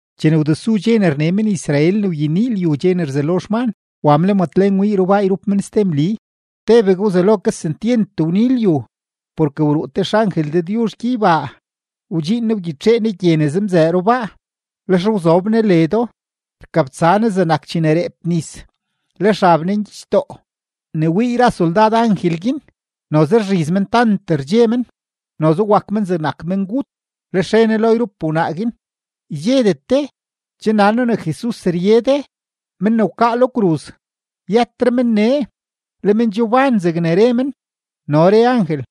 Chene wdesu dxe ne rne men-Israel ne wyenii lyu dxe ne rzelo xman, wa Mli Matlen wii rubaa yrup men ste Mli. Tebegue wzelo kesentyent wni lyu, porke wruu te xangel Dëdyuzh gyeybaa, wdxiin ne wgyitxee ne gye ne zemzëë rubaa, lex wzob ne ledo. Rkabtsa ne zegnak chene reep nis, le xab ne ngyichdoo. Ne wii yra soldad angel guin, noze rzhiz men tant rdxe men, noze wak men zegnak mengut. Lex re ne lo yrup wnaa guin: ―Ydxedet de. Che nan noo ne Jesus rye de, men ne wkaa lo kruz. Yëtre men nee; le men che wban zegne re men. No re angel: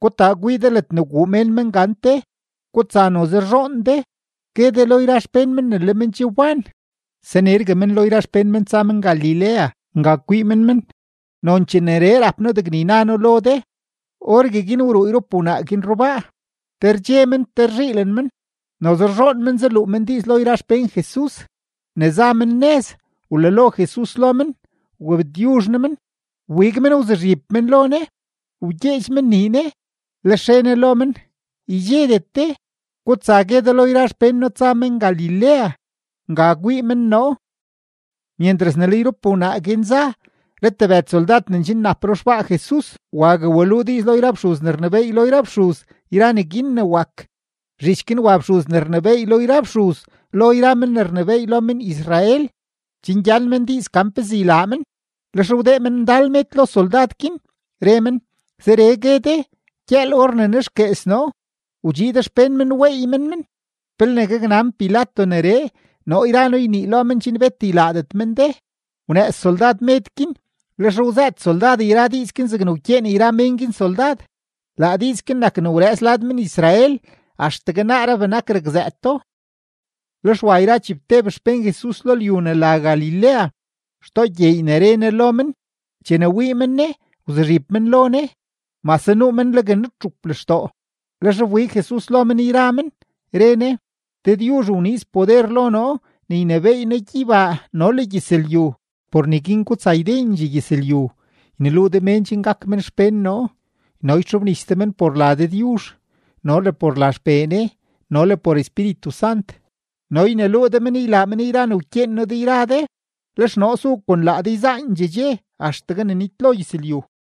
―Gutaa kwii de ledne wguu mén men gante. Gutsa noze rzhoon de, gue de lo yra xpén men ne le men che wban. Sanergue men lo yra xpén men tsa men Galilea; nga kwii men men. Nonchee neree rap noo degne yna noo lo de. Orgueguin wruu yrup wnaa guin rubaa, te rdxe men te rzhiilen men; noze rzhoon men zaluu men diiz lo yra xpén Jesus. Ne za men nëz, wlalo Jesus lo men, wgabtyuzh Ne men. Wbig men wzuzhib men lo Ne, wgyeedx men nii Ne. Lex re Ne lo men: ―Ydxedet de; gutsa gue de lo yra xpén noo tsa men Galilea; nga kwii men noo. Myentras ne le yrup wnaa guin za, le tebëd soldad ne ndxinnap ruxbaa Jesus wague waluu diiz lo yra fxuz ne rnebééy lo yra fxuz yra neguin ne wak. Zhich guin wa fxuz ne rnebééy lo yra fxuz lo yra men ne rnebééy lo men-Israel chen gyan men diiz gan pezee ylaa men; lex wdee men ndal med lo soldad guin, re men: ―Zeree gue de: “Gyëël or ne nexguees noo, wdxiid xpén men weey men men.” Belne gaknan Pilato neree, noo yra noo ynii lo men chen bet ylaadet men de. Wnëëz soldad med guin, lex wzëët soldad yra diiz guin zegne wkyeen yra mén guin soldad. Laa diiz guin nak ne wrëëts lad men-Israel, axtegue naaree benak rakzëëto. Lex wa yra chibteb xpén Jesus lo lyu ne la Galilea, xtoo gyeey ne re Ne lo men. Chene wii men Ne, wzuzhib men lo Ne, mase nuu men legue nutxup lextoo. Lex wbig Jesus lo men yra men, re Ne: ―Dëdyuzh wniiz poder lo noo ne ynebééy noo gyeybaa no le gyëzlyu. Por neguin gutsa ydendxee gyëzlyu, yneluu de mén chen gak men xpén noo no ytxobnis de men por la Dëdyuzh no le por la XPee Ne no le por Espíritu Sant. No yneluu de men ylaa men yra ne wkyeen noo de yra de. Lex noo su kon laa de yzaandxee dxe axtegue ne nitlo gyëzlyu.